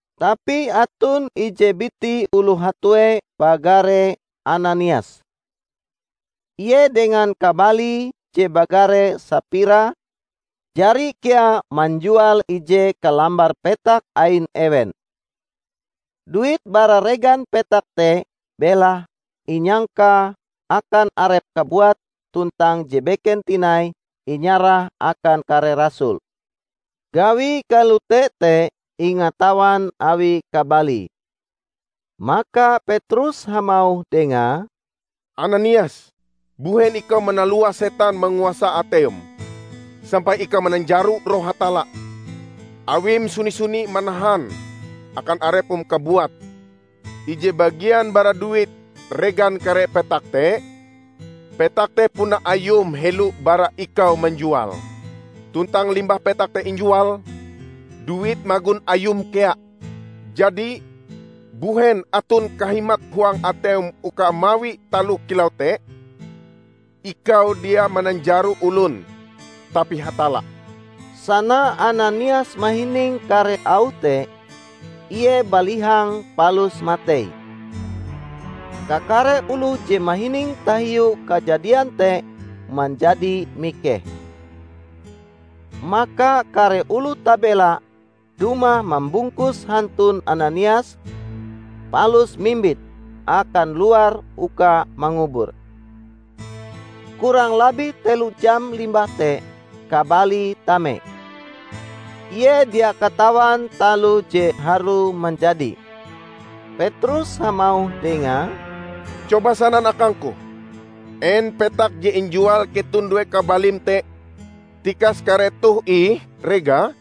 Tapi aton ije biti oloh hatue bagare Ananias. Ie dengan kabalie je bagare Sapira, jari kea manjual ije kalambar petak ain ewen. Duit bara regan petak te belahe inyangkae akan arepe kabuat tuntang je beken tinai inyarahe akan kare rasul. Gawie kalote te ingatawan awi kabalie. Maka Petrus hamauh dengae, "Ananias, mbuhen ikau manalua setan manguasa ateim, sampai ikau mananjaro Roh Hatalla, awim suni-suni manahan akan arepm kabuat ije bagian bara duit regan kare petak te? Petak te puna ayum helo bara ikau manjuale. Tuntang limbah petak te injual, duite magon ayum kea. Jadi mbuhen aton kahimat huang ateim uka mawi taloh kilau te? Ikau dia mananjaro olon tapi Hatalla!" Sana Ananias mahining kare auh te, ie balihang palus matei. Kakare oloh je mahining tahiu kajadian te manjadi mikeh. Maka kare oloh tabela dumah mambungkus hantun Ananias, palus mimbite akan luar uka mangubure. Kurang labih telo jam limbah te kabalie tame. Ie dia katawan taloh je harue manjadi. Petrus hamauh dengae, "Coba sanan akangku: En petak je injual keton due kabalim te, tikas kare toh ih regae?"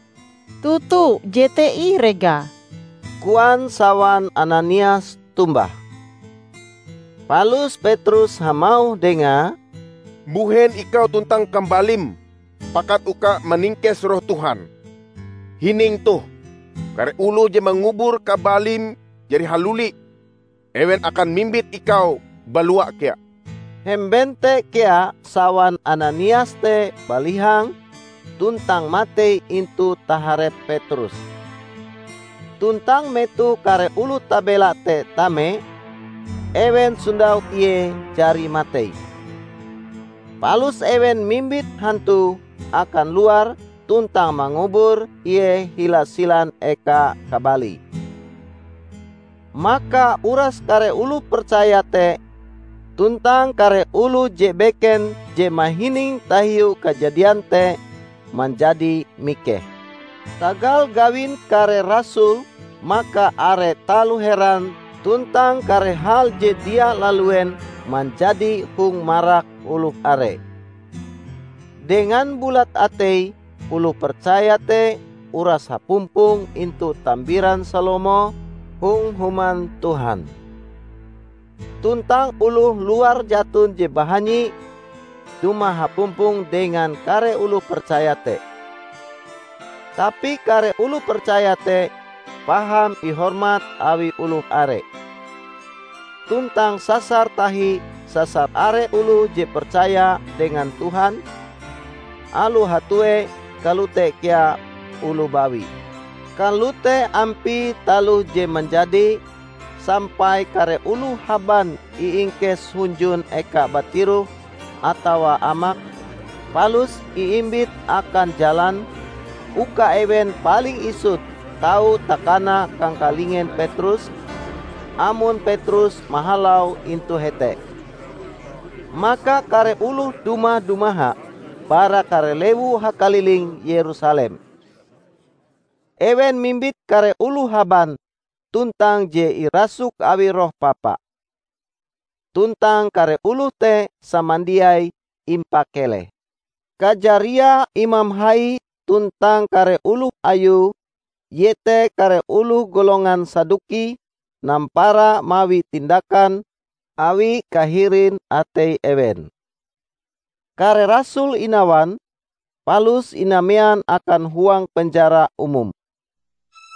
"Toto, jete ih regae," koan sawan Ananias tombah. Palus Petrus hamauh dengae, "Mbuhen ikau tuntang kabalim pakat uka maningkes Roh Tuhan? Hining toh! Kare oloh je mangubur kabalim jari haluli. Ewen akan mimbit ikau balua kea." Hemben te kea sawan Ananias te balihang tuntang matei intu taharep Petrus. Tuntang metoh kare oloh tabela te tame, ewen sondau ie jari matei. Palus ewen mimbit hantue akan luar tuntang mangubur ie hila silan eka kabalie. Maka uras kare oloh percaya te tuntang kare oloh je beken je mahining tahiu kajadian te, manjadi mikeh. Tagal gawin kare rasul maka are taloh heran tuntang kare hal je dia laluen manjadi hong marak oloh are. Dengan bulat ateie oloh percaya te uras hapumpong intu Tambiran Salomo hong Human Tuhan. Tuntang oloh luar jaton je bahanyi dumah hapumpong dengan kare oloh percaya te. Tapi kare oloh percaya te paham ihormat awi oloh are. Tuntang sasar tahi sasar are oloh je percaya dengan Tuhan, aloh hatue kalote kea oloh bawi. Kalote ampie taloh je manjadi, sampai kare oloh haban iingkes hunjun ekae batiroh atawa amak, palus iimbit akan jalan, uka ewen paling isut tau takana kangkalingen Petrus, amon Petrus mahalau intu hete. Maka kare oloh dumah-dumaha bara kare lewu hakaliling Yerusalem. Ewen mimbit kare oloh haban tuntang je irasuk awi roh papa. Tuntang kare oloh te samandiai impakeleh. Kajariae imam hai tuntang kare oloh ayue iete kare oloh golongan Saduki nampara mawi tindakan awi kahirin atei ewen. Kare rasul inawan, palus inamean akan huang penjara umum.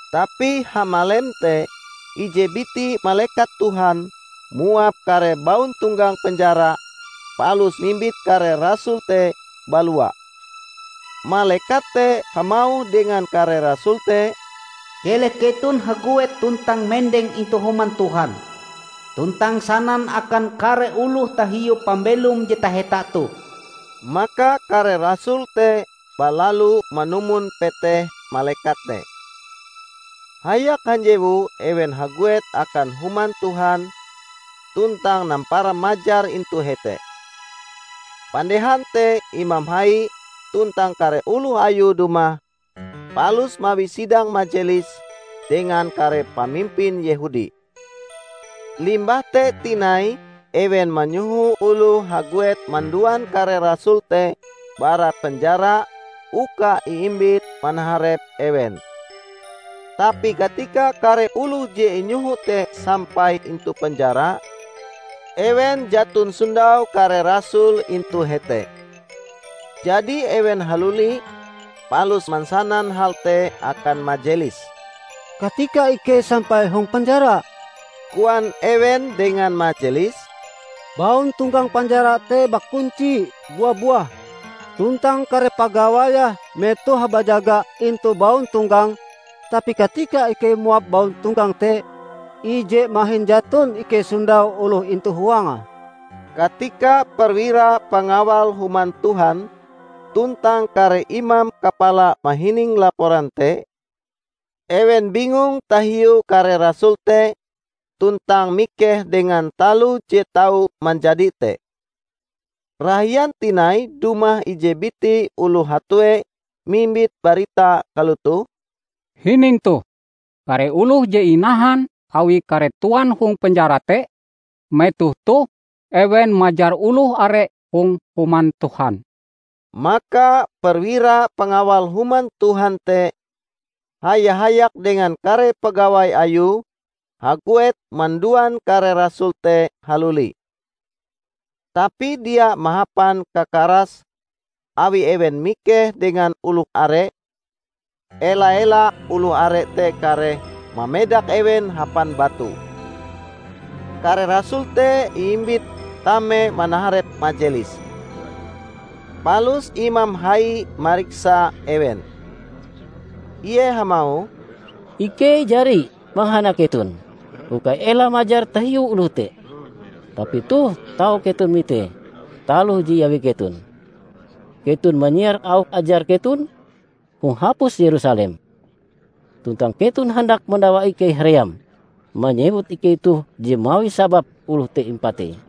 Tapi hamalem te, ije biti malekat Tuhan muap kare bauntonggang penjara palus mimbit kare rasul te balua. Malekat te hamauh dengan kare rasul te, "Keleh keton haguet tuntang mendeng intu Human Tuhan tuntang sanan akan kare oloh tahiu pambelom je taheta toh." Maka kare rasul te balalu manumon peteh malekat te. Hayak hanjewu ewen haguet akan Human Tuhan tuntang nampara majar intu hete. Pandehan te imam hai tuntang kare oloh ayue dumah, palus mawi sidang majelis dengan kare pamimpin Yehudi. Limbah te tinai ewen manyoho oloh haguet manduan kare rasul te bara penjara uka iimbit manaharep ewen. Tapi katika kare oloh je inyoho te sampai intu penjara, ewen jaton sondau kare rasul intu hete. Jadi ewen haluli, palus mansanan hal te akan majelis. "Katika ikei sampai hong penjara," koan ewen dengan majelis, "bauntonggang penjara te bakunci bua-buah, tuntang kare pagawaie metohe bajaga intu bauntonggang. Tapi katika ikei muap bauntonggang te, ije mahin jaton ikei sondau oloh intu huange." Katika perwira pangawal Human Tuhan tuntang kare imam kapala mahining laporan te, ewen bingung tahiu kare rasul te tuntang mikeh dengan taloh je tau manjadi te. Rahian tinai dumah ije biti oloh hatue mimbit barita kalotoh, "Hining toh! Kare oloh je inahan awi kare Tuan hong penjara te, metoh toh ewen majar oloh are hong Human Tuhan!" Maka perwira pangawal Human Tuhan te haya-hayak dengan kare pagawai ayue, haguet manduan kare rasul te haluli. Tapi dia mahapan kakaras, awi ewen mikeh dengan oloh are; ela-ela oloh are te kareh mamedak ewen hapan batu. Kare rasul te iimbit tame manaharep majelis. Palus imam hai mariksa ewen. Ie hamauh, "Ikei jari mangahana keton uka ela majar tahiu oloh te. Tapi toh tau keton mitee taloh je iawi keton! Keton manyiar auh ajar keton hong hapus Yerusalem, tuntang keton handak madawa ikei haream manyewut ikei toh je mawi sabab oloh te impatei."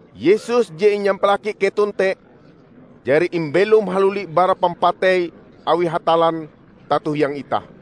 Yesus, je inyampalaki keton te, jari imbelom haluli bara pampatei awi Hatallan tato hiang itah.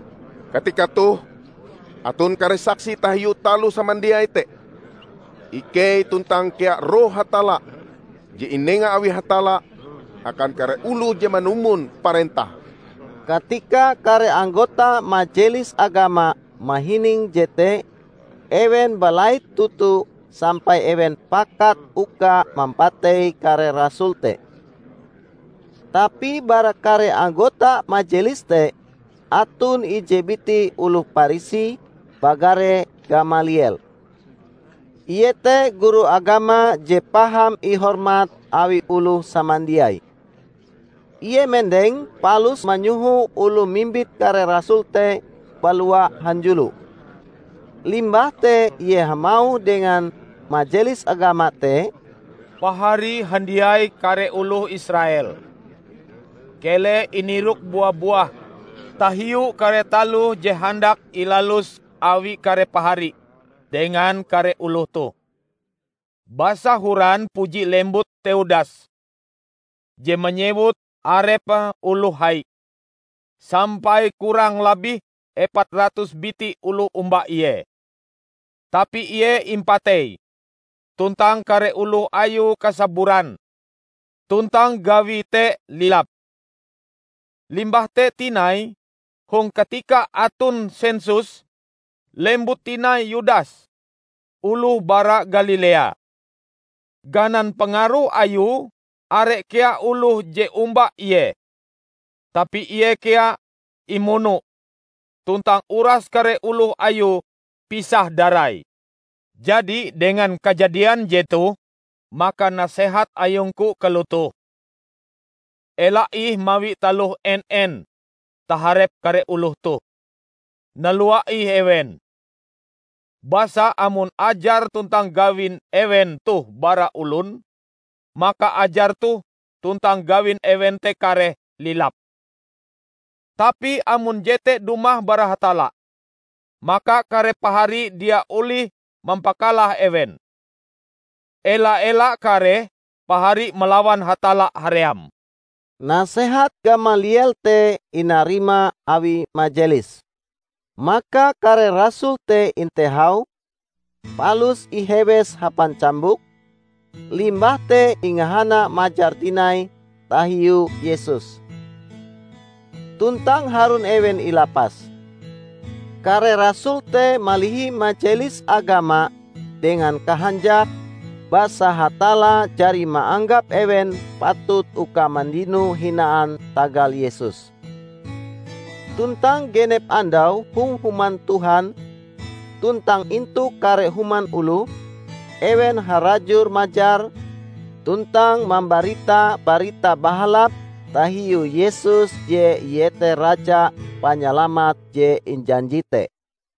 Katika toh aton kare saksi tahiu taloh samandiai te -- ikei tuntang kea Roh Hatalla je inenga awi Hatalla akan kare oloh je manumon parentahe." Katika kare anggota majelis agama mahining jete ewen balait toto sampai ewen pakat uka mampatei kare rasul te. Tapi bara kare anggota majelis te aton ije biti oloh Parisi bagare Gamaliel. Ie te guru agama je paham ihormat awi oloh samandiai. Ie mendeng palus manyoho oloh mimbit kare rasul te balua hanjulo. Limbah te ie hamauh dengan majelis agama te, "Pahari handiai kare oloh Israel! Keleh inirok bua-buah tahiu kare taloh je handak ilalus awi kare pahari dengan kare oloh toh. Basa horan puji lembut Teudas, je manyewut arepe oloh hai, sampai kurang labih epat ratus biti oloh omba ie. Tapi ie impatei tuntang kare oloh ayue kasaburan, tuntang gawie te lilap. Limbah te tinai, hong katika aton sensus, lembut tinai Yudas, oloh bara Galilea. Ganan pangaruh ayue, are kea oloh je omba ie. Tapi ie kea imuno, tuntang uras kare oloh ayue pisah darai. Jadi dengan kajadian jetoh maka nasehat ayungku kalotoh: ela ih mawi taloh en-en taharep kare oloh toh, nalua ih ewen. Basa amon ajar tuntang gawin ewen toh bara olon, maka ajar toh tuntang gawin ewen te kareh lilap. Tapi amon jete dumah bara Hatalla, maka kare pahari dia olih mampakalah ewen. Ela-ela kareh pahari malawan Hatalla haream." Nasehat Gamaliel te inarima awi Majelis. Maka kare rasul te intehau, palus ihewes hapan cambuk, limbah te ingahana majar tinai tahiu Yesus. Tuntang harun ewen ilapas. Kare rasul te malihi majelis agama dengan kahanjak basa Hatalla jari maanggap ewen patut uka mandino hinaan tagal Yesus. Tuntang genep andau hong Human Tuhan tuntang intu kare human oloh, ewen harajur majar tuntang mambarita Barita Bahalap tahiu Yesus je Ie te Raja Panyalamat je injanji te.